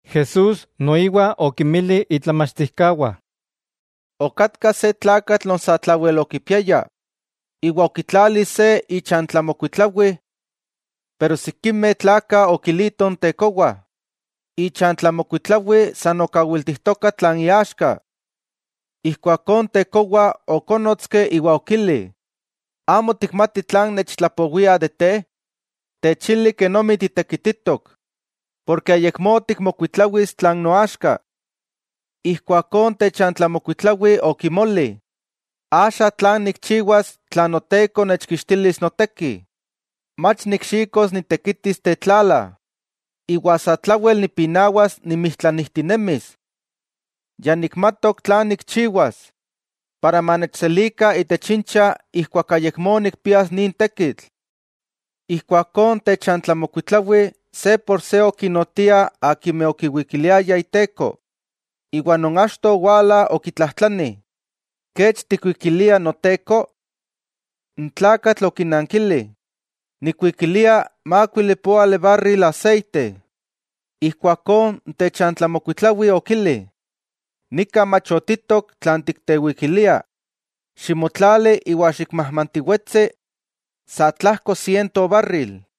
Jesús noiwa okinmili itlamachtijkawah: —Okatka se tlakatl non satlawel okipiaya, iwa okitlali se ichantlamokuitlawi. Pero sikimeh tlakah okilitoh n tekowa ichantlamokuitlawi san okawiltijtoka tlan iaxka. Ijkuakó n tekowa okónnotski iwa okili: “¿Amo tikmati tlan nechtlapowiah de te? Techili kenomi titekititok, porke ayakmó tikmokuitlawis tlan noaxka.” Ijkuakó n techantlamokuitlawi okimoli: “¿Axa tlan nikchiwas tla noteko nechkixtilis noteki? Mach nikxikos nitekitis tetlala, iwa satlawel nipinawas nimijtlanijtinemis. Ya nikmatok tlan nikchiwas, para manechselikah itech incha ijkuak ayakmó nikpias nin tekitl.” Ijkuakó n techantlamokuitlawi se por se okinnotiah akimeh okiwikiliayah iteko; iwa non achto owala okitlajtlani: “¿Kech tikuikilia noteko?” N tlakatl okinankili: “Nikkuikilia mákuili poali barril aseite.” Ijkuakó n techantlamokuitlawi okili: “Nika machotitok tlan tiktewikilia, ximotlali iwa xikmajmantiwetsi sa tlajko siento barril.”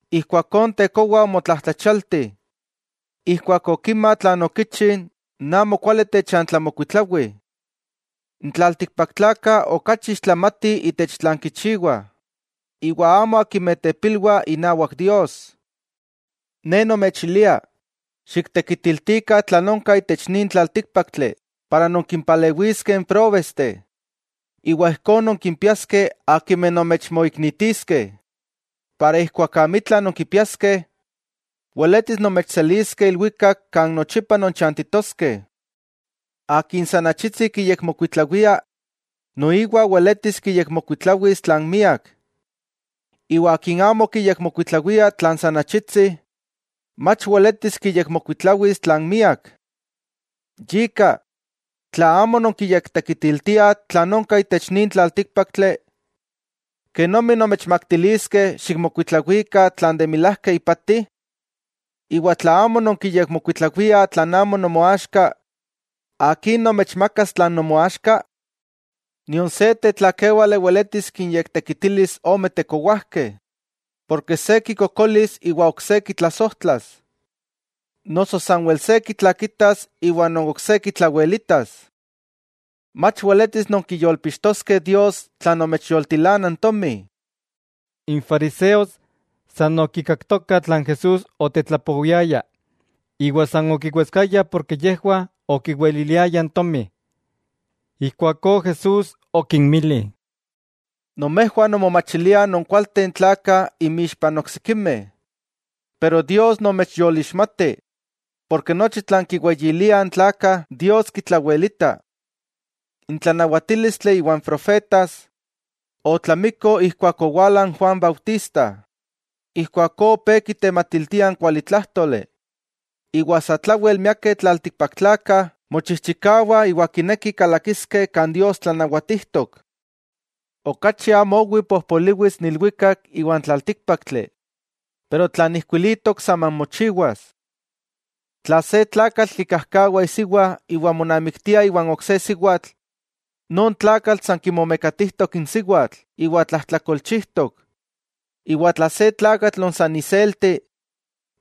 Ijkuakó n tekowa omotlajtlachialti ijkuak okima tlan okichi n amokuali techantlamokuitlawi. N tlaltikpaktlakah okachi ixtlamatih itech tlan kichiwah, iwa amo akimeh tepilwah inawak Dios. 'Ne nomechilia: Xiktekitiltikah tlan onka itech nin tlaltíkpaktli, para nonkimpalewiskeh n próbesteh iwa ijkó nonkimpiaskeh akimeh nomechmoiknitiskeh, para ijkuak amitla nonkipiaskeh, weletis nomechseliskeh ilwikak kan nochipa nonchantitoskeh. 'Akin san achitsi kiyekmokuitlawia, noiwa weletis kiyekmokuitlawis tlan miak; iwa akin amo kiyekmokuitlawia tlan san achitsi, mach weletis kiyekmokuitlawis tlan miak. Yika tla amo nonkiyektekitiltiah tlan onka itech nin tlaltíkpaktli, ¿kenomi nomechmaktiliskeh xikmokuitlawikah tlan de milajka ipati? Iwa tla amo nonkiyekmokuitlawiah tlan amo nomoaxka, ¿akin nomechmakas tlan nomoaxka? 'Nion se tlakéwale weletis kinyektekitilis ome tekowajkeh; porke se kikokolis iwa n ok se kitlasojtlas, noso sanwel se kitlakitas iwa n ok se kitlawelitas. Mach weletis nonkiyolpixtoskeh Dios tla nomechyoltilana n tomi. N fariseos san okikaktokah tlan Jesús otetlapowiaya, iwa san okiwetskayah porke yejwah okiweliliayah n tomi. Ijkuakó Jesús okinmili: —Nomejwah nonmomachiliah nonkualteh n tlakah imixpah n oksikimeh, pero Dios nomechyolixmati, porke nochi tlan kiweyiliah n tlakah, Dios kitlawelita. 'N tlanawatílistli iwa n profetas otlamiko ijkuak owala n Juan Bautista. Ijkuakó opé kitematiltia n kualitlájtoli iwa satlawel miakeh tlaltikpaktlakah mochijchikawah iwa kinekih kalakiskeh kan Dios tlanawatijtok. 'Okachi amo owi pojpoliwis n ilwikak iwa n tlaltíkpaktli, pero tlan ijkuilitok saman mochiwas. 'Tla se tlakatl kikajkawa isiwa iwa monamiktia iwan ok se siwatl, non tlakatl san kimomekatijtok n siwatl iwa tlajtlakolchijtok. Iwa tla se tlakatl non san iselti,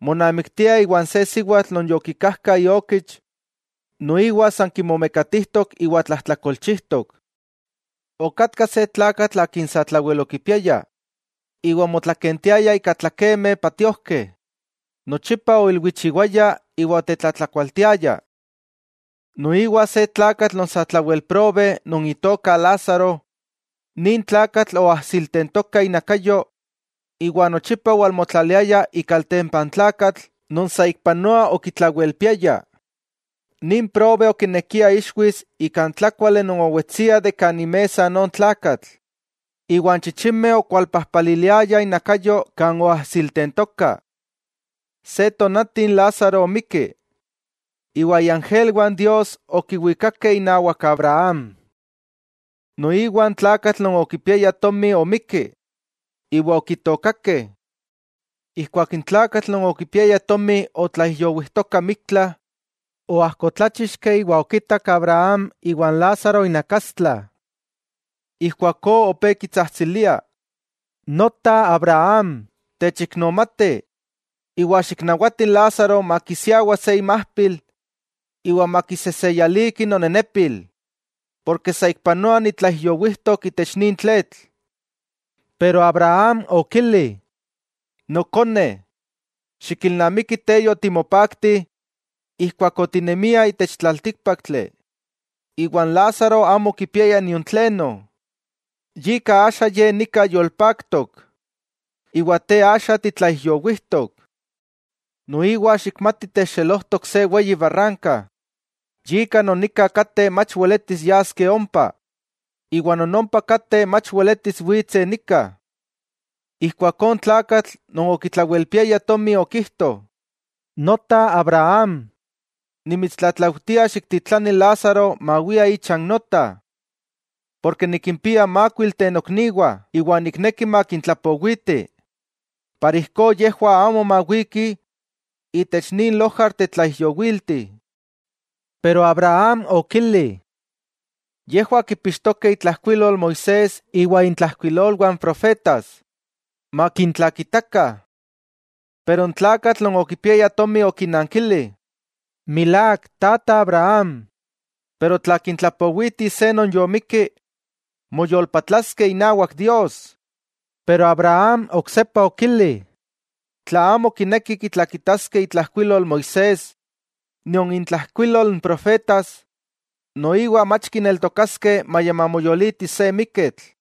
monamiktia iwan se siwatl non yokikajka iokich, noiwa san kimomekatijtok iwa tlajtlakolchijtok. 'Okatka se tlakatl akin satlawel okipiaya, iwa omotlakentiaya ika tlakemeh patiojkeh; nochipa oilwichiwaya iwa otetlatlakualtiaya. Noiwa se tlakatl non satlawel probe non itoka Lázaro, nin tlakatl oajsiltentoka inakayo iwa nochipa owalmotlaliaya ikaltempa n tlakatl non saikpanoa okitlawelpiaya. Nin probe okinekia ixwis ika n tlákuali non owetsia de kan imesa non tlakatl; iwa n chichimeh okualpajpaliliayah inakayo kan oajsiltentoka. Se tonati n Lázaro omikki, iwa iangelwah n Dios okiwikakeh inawak Abraham. Noiwa n tlakatl non okipiaya tomi omikki, iwa okitookakeh. Ijkuak n tlakatl non okipiaya tomi otlaijyowijtoka miktla, oajkotláchixki iwa okitak Abraham iwa n Lázaro inakastla. Ijkuakó opé kitsajtsilia: “Nota Abraham, techiknomati, iwa xiknawati n Lázaro makisiawa se imajpil iwa makiseseyaliki nonenepil, porke saikpanoa nitlaijyowijtok itech nin tletl.” Pero Abraham okili: “Nokone, xikilnamiki te yotimopaakti ijkuak otinemia itech tlaltíkpaktli, iwa n Lázaro amo okipiaya nion tleno. Yika axa ye nika yolpaktok, iwa te axa titlaijyowijtok. Noiwa xikmati techxelojtok se weyi barranka, yika non nika kateh mach weletis yaskeh ompa, iwa non ompa kateh mach weletis witseh nika.” Ijkuakó n tlakatl non okitlawelpiaya tomi okijto: “Nota Abraham, nimitstlatlaujtia xiktitlani n Lázaro mawia ichan nota, porke nikimpia mákuilteh nokniwah iwa nikneki makintlapowiti, para ijkó yejwah amo mawikih itech nin lojar tetlaijyowilti.” Pero Abraham okili: “Yejwah kipixtokeh itlajkuilol Moisés iwa intlajkuilolwah n profetas; ¡makintlakitakah!” Pero n tlakatl non okipiaya tomi okinankili: “Milák, tata Abraham, pero tla kintlapowiti se non yomikki, moyolpatlaskeh inawak Dios.” Pero Abraham oksepa okili: “Tla amo kinekih kitlakitaskeh itlajkuilol Moisés nion intlajkuilol n profetas, noiwa mach kineltokaskeh maya mamoyoliti se miketl.”